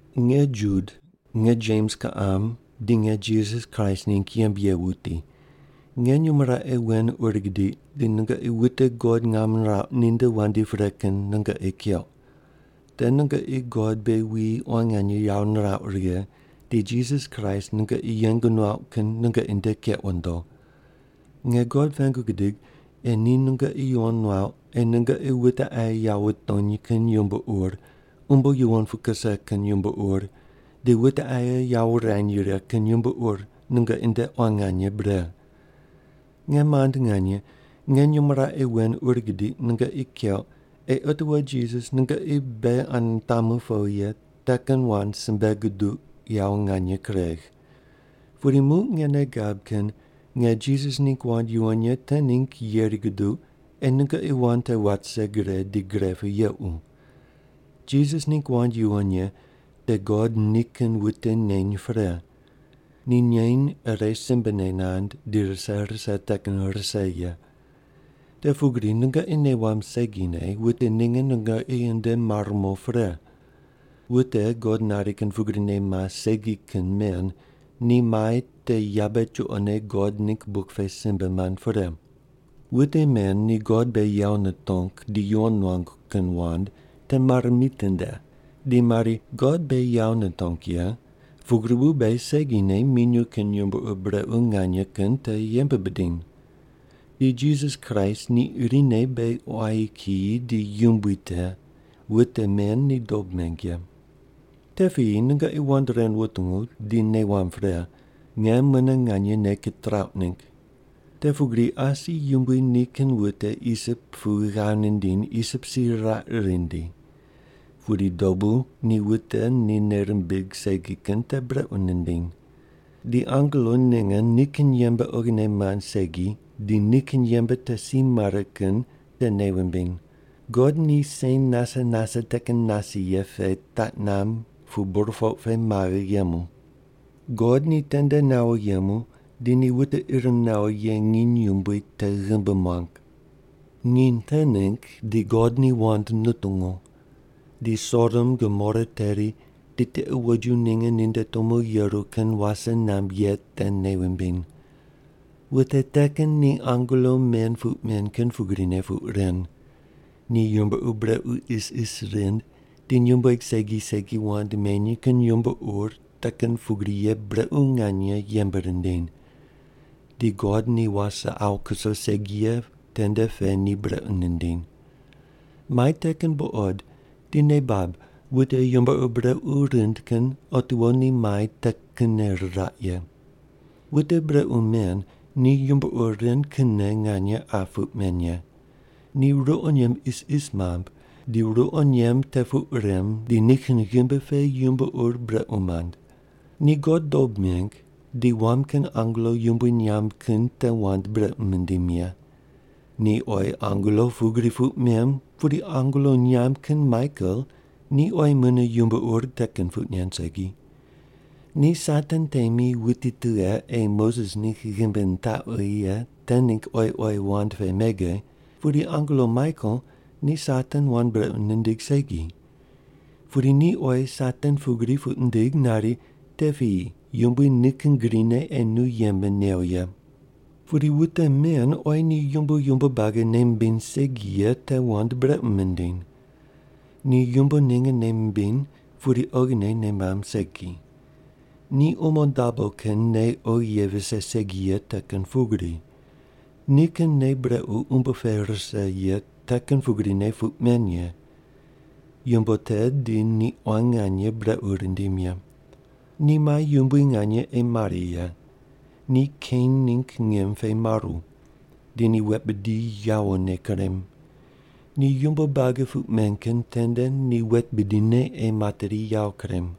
Nge Jud, nge Jems kiqam, di nge Jisas Kraist ningg yembe ye wuti. Nge nyumo raqe wen ur gidiq di nungoqi wute God ngam nirauq ninde wandi pre kin nungoqi keuq. Te nungoqi God beghi wuyi quan nganye yawo nirauq righe di Jisas Kraist nungoqi yeng nuauq kin nungoqi nde keq wundo. Nge God pengu gidig ei ni nungoqi yuwon nuauq ei nungoqi wute aye yawo wutony kin yumbo ur, umbo yuwon pu kuse kin yumbo ur, di wute aye yawo wurany righe kin yumbo ur nungoqi nde quan nganye bre. Nge mand nganye, nge nyumo raqe wen ur gidiq nungoqi keuq ei otiwo Jisas nungoqi beghi ane nitamu powi ye te kin wand simbe guduq yawo nganye kuregh. Pudi muq nge nei gab kin nge Jisas ningg wand yuwon ye te ningg yeri guduq ei nungoqi wand te wat rise gre di gre pu yequ. Jisas ningg wand yuwon ye te God nikin wute neny pre. Ni neny ire simbene nand di rise rise te kin rise ye. Te pugri nungoqi nei wamb segine wute ninge nungoqi nde mar mo pre. Wute God nari kin pugrine mas segi kin men ni mai te yabe chuqone God ningg buk pe simbe mand pre. Wute men ni God beghi yawo nitong di yuwon nuangu kin wand te mare mitinde di mari, God beghi yawo nitong ye, pugri bu beghi segine minyuw kin yumbo ur brequ nganye kin te yembe bidiny. Di Jisas Kraist, ni irine beghi quayi kiyi di Yumbui te, wute men ni dob meng ye. Te piyi nungoqi wand ren wutungu di nei wamb pre, nge mune nganye nei kitrauq ningg. Te pugri asi Yumbui nikin wute Isip pu ghav nindiny Isip si riraq rindi. Pudi dobu ni wute ni nei rimbig segi kin te brequ nindiny. Di angelo ninge nikin yembe oghine mand segi di nikin yembe te si mare kin te nei wumbiny. God ni sen nase nase te kin nase ye pe taq namb pu burpoq pe maghe yemu. God ni tende nawo yemu di ni wute ir nawo ye nginy yumbui te ghimbi muang. Nginy te ningg di God ni wand nutungu. Di Sodom Gomora teri di tiqe woju ninge ninde tumo yeru kin wase namb ye te nei wumbiny. Wute te kin ni angelo men puq men kin pugrine puq ren. Ni yumbo ur brequ isis rind di nyumbueg segi segi wand meny kin yumbo ur te kin pugri ye brequ nganye yembe rindiny. Di God ni wase awu kuso segi ye tende pe ni brequ nindiny. Mai te kin buqod di nei bab wute yumbo ur brequ rind kin otiwo ni mai te kinne riraq ye. Wute brequ men ni yumbo ur ren kinne nganye qa puq men ye. Ni ruqo nyemb isis mamb di ruqo nyemb te puq rem di nikin ghimbi pe yumbo ur brequ mand. Ni God dob meng di wam kin angelo yumbui nyamb kin te wand brequ mindim ye. Ni oyi angelo pugri puq mem pudi angelo nyamb kin Maikel ni oyi mune yumbo ur te kin puq nen segi. Ni Satan temi wuti tughe ei Moses ningg ghimbi nitaqwi ye te ningg oyi oyi wand pe mege, pudi angelo Maikel ni Satan wand brequ nindig segi. Pudi ni oyi Satan pugri puq nindig nari, “Te piyi Yumbui nikin grine ei nu yembe new ye.” Pudi wute men oyi ni yumbo yumbo buagi nei mimbiny segi ye te wand brequ mindiny. Ni yumbo ninge nei mimbiny pudi oghine nei mamb segi. Ni umo dabo kin nei oghi ye vise segi ye te kin pugri. Nikin nei brequ umbo pe rise ye te kin pugrine puq men ye. Yumbo te di ni quan nganye brequ rindim ye. Ni mai yumbui nganye ei mare ye. Ni Kein ningg ngim pe maru. Di ni wet bidi yawone kurem. Ni yumbo buagi puq men kin tende ni wet bidine ei materi yawo kurem.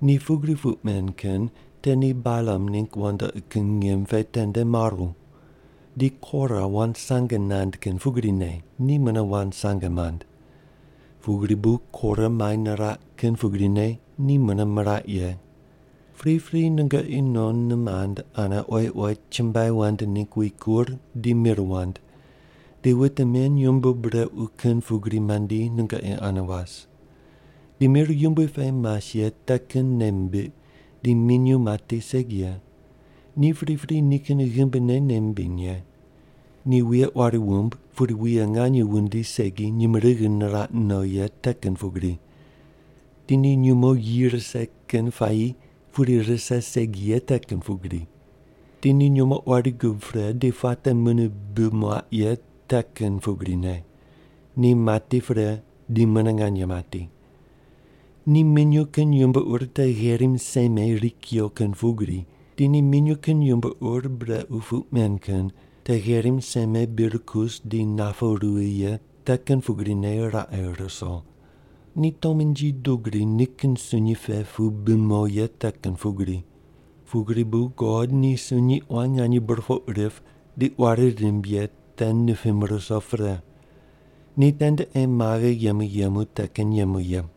Ni pugri puq men kin te ni Balam ningg wandoqi kin ngim pe tende maru. Di Kora wand sange nand kin pugrine ni mune wand sange mand. Pugri bu Kora mai niraq kin pugrine ni mune miraq ye. Pripri nungoqi non nimand ane oyi oyi chumbuai wand ningg wikur di mir wand, di wute men yumbo brequ kin pugri mandi nungoqi ane was. Ni mir yumbui pe mas ye te kin nei mimbiq di minyuw mati segi ye, ni pripri nikin ghimbine nei mimbiny ye. Ni wuye quari wumb pudi wuye nganye wundi segi nyumurighi niraq no ye te kin pugri. Di ni nyumo yi rise kin puayi pudi rise segi ye te kin pugri. Di ni nyumo quari gub pre di puate mune bi muaq ye te kin pugrine, ni mati pre di mune nganye mati. Ni minyuw kin yumbo ur te gherim seme ri kuyo kin pugri, di ni minyuw kin yumbo ur brequ puq men kin te gherim seme bir kus di napu ruwi ye te kin pugrine raqe ruso. Ni tomnji dugri nikin sunyi pe pu bi mo ye te kin pugri. Pugri bu God ni sunyi quan nganye burpoq rip di quari rimb ye te nipim ruso pre. Ni tende ei maghe yemu yemu te kin yemu ye.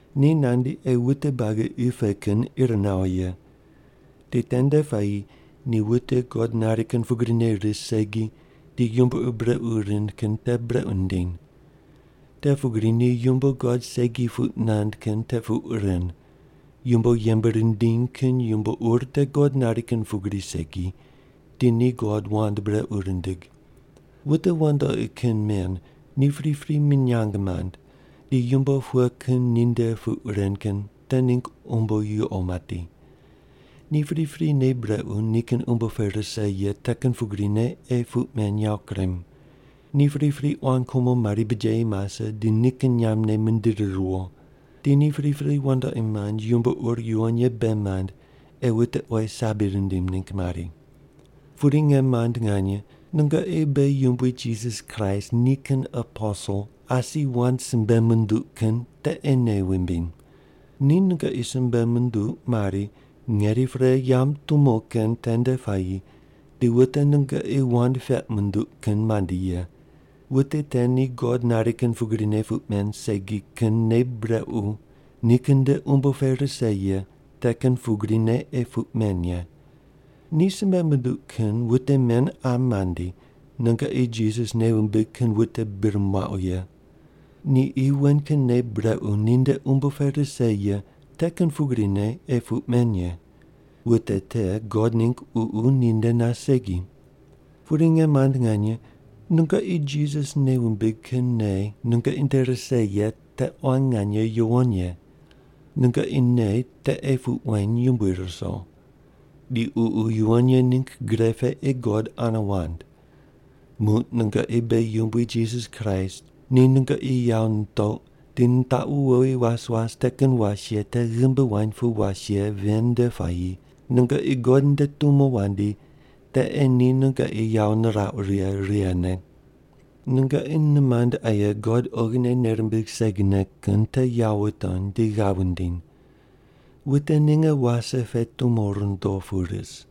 Ni nandi ei wute buagi qi pe kin ir nawo ye. Di tende puayi ni wute God nari kin pugrine ris segi di yumbo ur brequ rind kin te brequ nindiny. Te pugri ni yumbo God segi puq nand kin te puq ren, yumbo yembe rindiny kin yumbo ur te God nari kin pugri segi di ni God wand brequ rindig.” Wute wandoqi kin men ni pripri minyang mand di yumbo pughe kin ninde puq ren kin te ningg umbo yuqo mati. Ni pripri nei brequ nikin umbo pe rise ye te kin pugrine ei puq men yawo kurem. Ni pripri quan kumo mari bijeyi mase di nikin nyambne mindiri riwo. Di ni pripri wandoqi mand yumbo ur yuwon ye bei mand ei wute oyi sabi rindim ningg mari. Pudi nge mand nganye, nungoqi beghi Yumbui Jisas Kraist nikin aposel asi wand simbe munduq kin te ei nei wumbiny. Ni nungoqi simbe munduq mari, “Ngeri pre yamb tumo kin tende puayi di wute nungoqi wand peq munduq kin mandi ye. Wute te ni God nari kin pugrine puq men segi kin nei brequ nikin nde umbo pe rise ye te kin pugrine ei puq men ye.” Ni simbe munduq kin wute men qa mandi nungoqi Jisas nei wumbig kin wute bir muaqu ye. Ni qi wen kin nei brequ ninde umbo pe rise ye te kin pugrine ei puq men ye. Wute te God ningg Ququ ninde nas segi. Pudi nge mand nganye, nungoqi Jisas nei wumbig kin nei nungoqi nde rise ye te quan nganye yuwon ye. Nungoqi nei te ei puq weny yumbui ruso. Di Ququ Yuwon Ye ningg gre pe ei God ane wand. Muq nungoqi beghi Yumbui Jisas Kraist ni nungoqi yawo nitouq di nitaqu wowi was was te kin was ye te ghimbi wuany pu was ye ven nde puayi, nungoqi God nde tumo wandi te ei ni nungoqi yawo nirauq righe righene. Nungoqi nimand aye God oghine nei rimbig segine kin te yawo wutony di ghav wundiny. Wute ninge wase pe tumo rundo pu ris.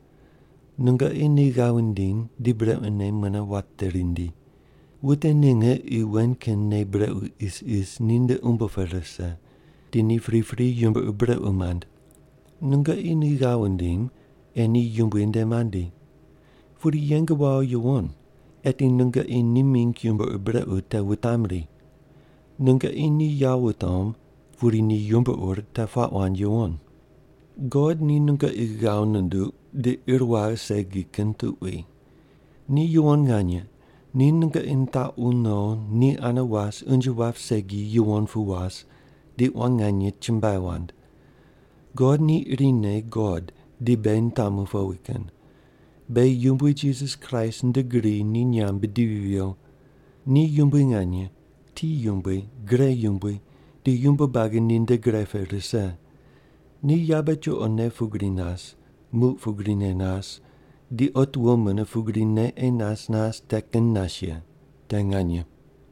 Nungoqi ni ghav wundiny di brequne mune wate rindi. Wute ninge qi wen kin nei brequ isis ninde umbo pe rise, di ni pripri yumbo ur brequ mand. Nungoqi ni ghav wundim ei ni Yumbui nde mandi. Pudi yeng wawo yuwon eti nungoqi ni mingg yumbo ur brequ te wutam ri. Nungoqi ni yawo wutom pudi ni yumbo ur te puaq wand yuwon. God ni nungoqi ghav nunduq di ir waghe segi kin tuqui. Ni yuwon nganye, ni nungoqi nitaqu no ni ane was unje wap segi yuwon pu was, di quan nganye chumbuai wand. God ni irine God di beghi nitamu powi kin. Beghi Yumbui Jisas Kraist nde gri ni nyamb bidivi viyo. Ni yumbui nganye, ti yumbui, gre yumbui, di yumbo buagi ninde gre pe rise. Ni yabe chuqone pugri nas, muq pugrine nas, di otiwo mune pugrine ei nas nas te kin nas ye. Te nganye.